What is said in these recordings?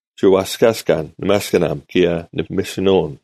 ᒋ ᐛᔅᑲᔅᑲᓐ ᓂᒪᔅᑭᓇᒻ ᑭᔭ ᓂᐱᒥᓯᓄᐅᓐ,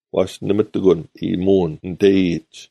ᐛᔅ ᓇᒪ ᑎᒂᓐ ᐃᔨᒧᐅᓐ ᓂᑕᔨᔨᒡ,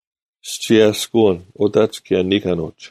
ᔅᒋ ᐊᔅᑯᐅᓐ ᐅᑕᒡ ᑭᔭ ᓂᑲᓄᒡ,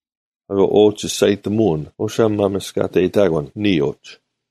ᐊᑯ ᐅ ᒋᔅᒐᔨᑎᒧᐅᓐ ᐅᓴᒻ ᒪᒥᔅᑲᑕᔨᑕᑯᓐ ᓂᔾ ᐅᒡ: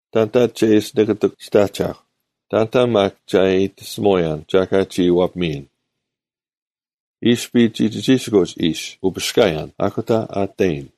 ᑕᓐᑕ ᒐ ᐃᓯ ᓂᑭᑎᒃ ᒋᑦ ᐊᒐᐧᒄ? ᑕᓐᑕ ᒪᒃ ᒐ ᐃᑎᓯᒧᔭᓐ ᒐ ᐊᑲ ᒋ ᐛᐱᒥᔨᓐ? ᐃᔅᐱ ᒋᒋᒋᓯᑯᒡ ᐃᓯ ᐅᐱᔅᑲᔭᓐ, ᐊᑯᑕ ᐊ ᑕᔨᓐ: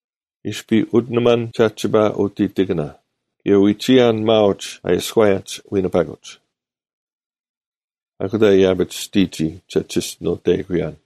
ᐃᔅᐱ ᐅᑎᓇᒪᓐ ᒐᒋᓴᐸ ᐅᑎᑎᑭᓇ, ᑭᔭ ᐎᒋᔭᓐ ᒪᐅᒡ ᐊ ᐃᔎᔭᒡ ᐎᓂᐸᑯᒡ; ᐊᑯᑕ ᐃᔭᐱᒡ ᒋᑎᒋᔾ ᒐ ᒋᔅᒋᓄᑕᐃᑯᔭᓐ,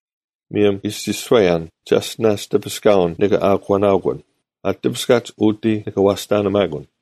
ᒧᔭᒻ ᐃᔅᒋᔄᔭᓐ, “ᒐᔅᑎᓇᔅ ᑎᐱᔅᑲᐅᓐ ᓂᑭ ᐊᒂᓇᐅᑯᓐ; ᐊ ᑎᐱᔅᑲᒡ ᐅᑎ ᓂᑭ ᐛᔅᑕᓂᒪᑯᓐ᙮”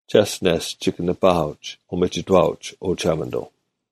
ᒐᔅᑎᓇᔅ ᒋᑭ ᓂᐸᐊᐅᒡ ᐅᒥᒋᑥᐅᒡ, ᐅ ᒋᓴᒪᓂᑐᐤ: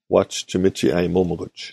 ᐛᔅ ᒋ ᒥᒋ ᐊᔨᒧᒥᑯᒡ,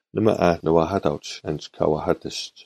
ᓇᒪ ᐊ ᓂ ᐛᐧᑲᑕᐅᒡ ᐊᓐᒡ ᑲ ᐛᐧᑲᑎᔅᒡ?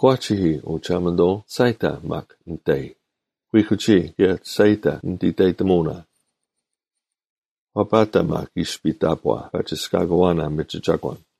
(Proper-11 Year A) 23ᑯᒂᒋᐃ, ᐅ ᒋᓴᒪᓂᑐᐤ, ᒋᔅᒐᔨᑕ ᒪᒃ ᓂᑕᐃ; ᑯᒋᐃ, ᑭᔭ ᒋᔅᒐᔨᑕ ᓂᑦ ᐃᑕᔨᑎᒧᐅᓇ: 24ᐛᐸᑕ ᒪᒃ ᐃᔅᐱ ᑕᑈ ᐸᒋᔅᑲᑯᐛᓇ ᒥᒋ ᒐᒂᓐ,